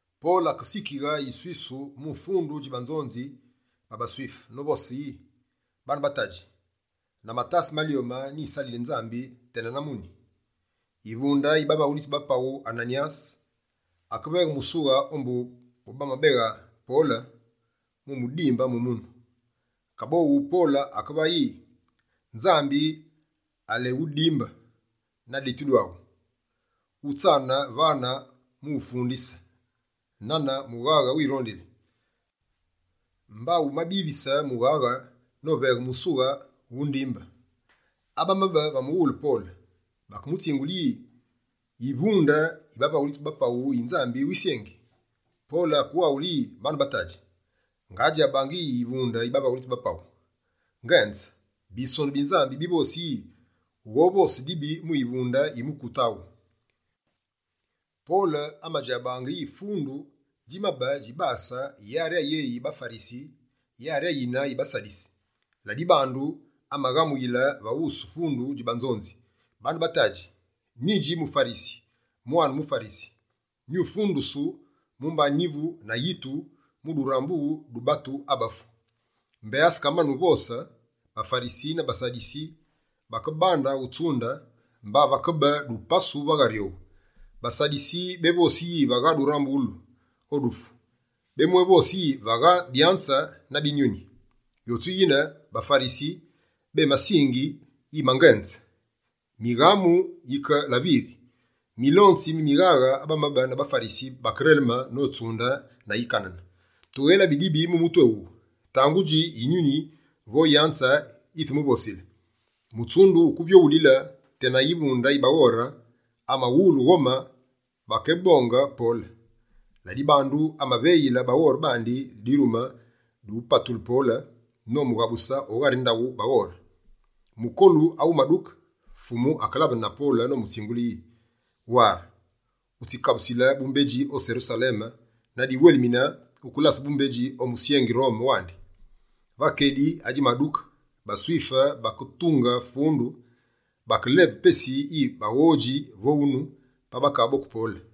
Pole akesikighe yiswisu mu fundu dji banzonzi ba baSwife, novose yi: «Bane ba tadji, na matase malyome, nyisalili Nzambi tena na muni.» Yivunde yi bavaghulitsi ba paghu Ananyase, akeveghe musughe ombu bobamabe beli na Pole, wumudimbe mu munu. Kaboghu Pole akevaghe yi: «Nzambi aléwudimbe, na deti aghu! Wutsane vane mu ufundise nane mughaghe wirondili, mba wumabise mughaghe noveghe mu usughe wu undimbe!» Abamabe va mughule Pole, bakemutsingule yi: «Yivunde yi bavaghulitsi ba paghu yi Nzambi wisyengi!» Pole akewaghule yi, «Bane ba tadji, ngadjabaange yi yivunde yi bavaghulitsi ba paghu. Ngenze, Bisonu bi Nzambi bivosi yi: “Wughovose dibi mu yivunde yi mukute aghu!”» Pole amadjabaange yi fundu djimabe djibase yari ayéyi baFarisi, yari ayine baSadisi. Ladibandu, amaghamuyile va wusu fundu dji banzonzi: «Bane ba tadji, nyidji muFarisi, mwane muFarisi. Nyifundusulu, mumba nyivu na yitu mu durambughulu du abafu.» Mbé asekamane ne uvose, baFarisi na baSadisi bakebande utsunde, mba vakebe dupasu va ghari owu. BaSadisi, bévosi yi vagha durambughulu o dufu, bemwévose yi vagha byanze na binyuni. Yotsu yine, baFarisi bémasingi yi mangenze. Mighamu yike la viri. Milonzi mi mighaghe, abamabe na baFarisi, bakereleme notsunde na yikanene: «Tughélabi dibi mu mutu éwuwu. Tangudji yinyuni vo yanze yitsimuvosile?» Mutsundu wukevyoghulile, tena yivunde yi baghore amawulu ghome bakéboke Pole. Ladibandu, amaveyile baghore bandi dirume dyuyébapatule Pole, nomughabuse o ghari ndaghu baghore. Mukolu awumaduke, Fumu akelabene na Pole nomutsingule yi: «Ware! Wutsikabusile bumbedji o Serusaleme, na diwelimine wukelase bumbedji o musyengi Rome wandi.» Va kedi adjimaduke, baSwife baketunge fundu. Bakeleve pesi yi baghodji vo unu, pa bakaboke Pole.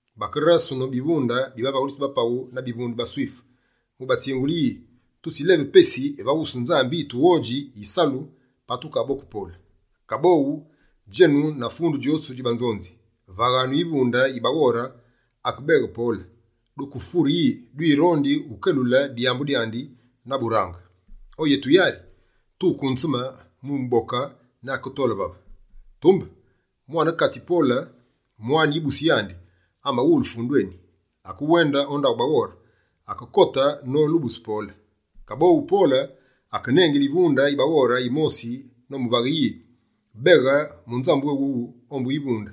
Bakérasene bivunde bi bavaghulitsi ba paghu na bivunde bi baSwife, mu batsingule yi: «Tutsileve pesi va wusu Nzambi yi tughodji yisalu, pa tukaboke Pole. Kaboghu, djenu na fundu djotsu dji banzonzi, vaghanu yivunde yi baghore akebeghe Pole, dukefure yi dwirondi ukelule dyambu dyandi na burange. O yetu yari, tukunzeme mu muboke ne aketole vave.» Tumbe mwane-katsi Pole, mwane yibusi yandi, amawulu fundu eni. Akewende o ndaghu baghore, akekote nolubuse Pole. Kaboghu Pole akenengile yivunde yi baghore yimosi nomuvaghe yi: «Beghe munzambu éwuwu ombu yivunde,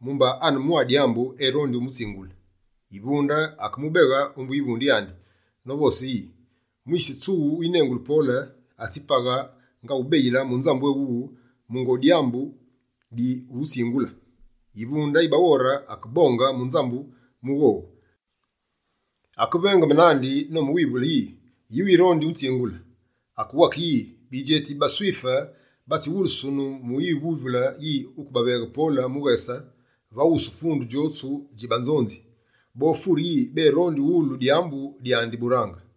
mumba ane mwa dyambu erondi umutsingule.» Yivunde akemubeghe ombu yivunde yandi, novose yi: «Mwise tsughu winengulu Pole, atsipaghe nga wubeyile munzambu eni wuwu, mungo dyambu dyuwutsingule.» Yivunde yi baghore akebonge munzambu mu dikake, akevengeme nandi nomuwivule yi: «Yi wirondi unzingule?» Akewake yi: «Bidjeti bi baSwife batsiwulusunu mu wuwivule yi wukebeghe Pole mughese va wusu fundu djotsu dji banzonzi. Bofure yi bérondi uwulu dyambu dyandi burange.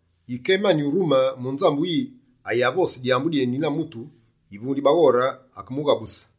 Yike emani urume munzambu yi ayavose dyambu dyeni na mutu, yivunde yi baghore akemughabuse.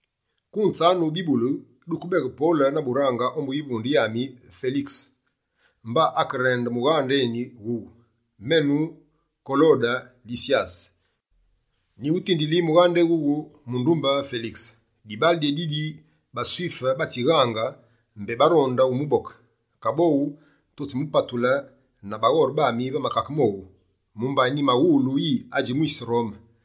Kunzanu bibulu duke beghe Pole na burange ombu yivunde yami Felikese.» Mba akerende mughande eni wughu: «Menu Kolode Lisyase, nyiwutindili mughade ewuwu mundumbe Felikese. Dibale dyédidi, BaSwife batsighaange mbé baronde umuboke, kaboghu tutsimupatule na baghore bami va makake mowu, mumba nyimawulu yi adji mwise Rome.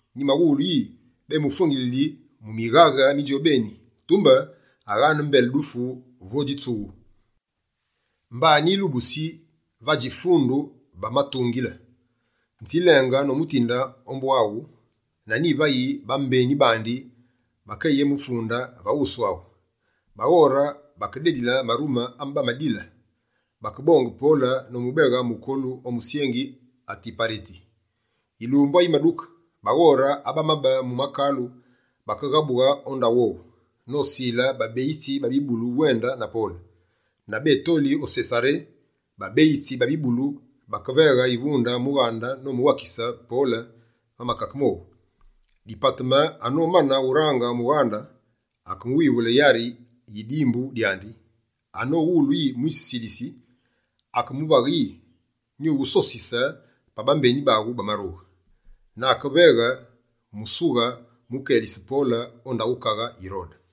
Nyimaghulu yi bémufwengilili mu mighaghe mi djobeni, tumbe aghane mbele dufu vo dji tsughu. Mba nyilubusi yi vadji fundu bamutungile. Nzilenge nomutinde ombu waghu na nyivayi bambeni bandi bakeyimufunde va wusu aghu.» Baghore bakededile marume ame bamadile. Bakebonge Pole nomubeghe mukolu o musyengi Atipareti. Yilumbu ayimaduke, baghore abamabe mu makulu bakeghabughe o ndaghu owu, nosile babeyitsi ba bibulu uwende na Pole. Na bétoli o Sesaré, babeyitsi ba bibulu bakeveghe yivunde mughande, nomuwakise Pole va makake mowu. Dipateme anomane urange mughande, akemuwivule yari yi dimbu dyandi. Anowulu yi mwise Silisi, akemuvaghe yi: «Nyuwusosise pa bambeni baghu bamarughe.» Na akeveghe musughe wukelise Pole o ndaghu kaghe Yirode.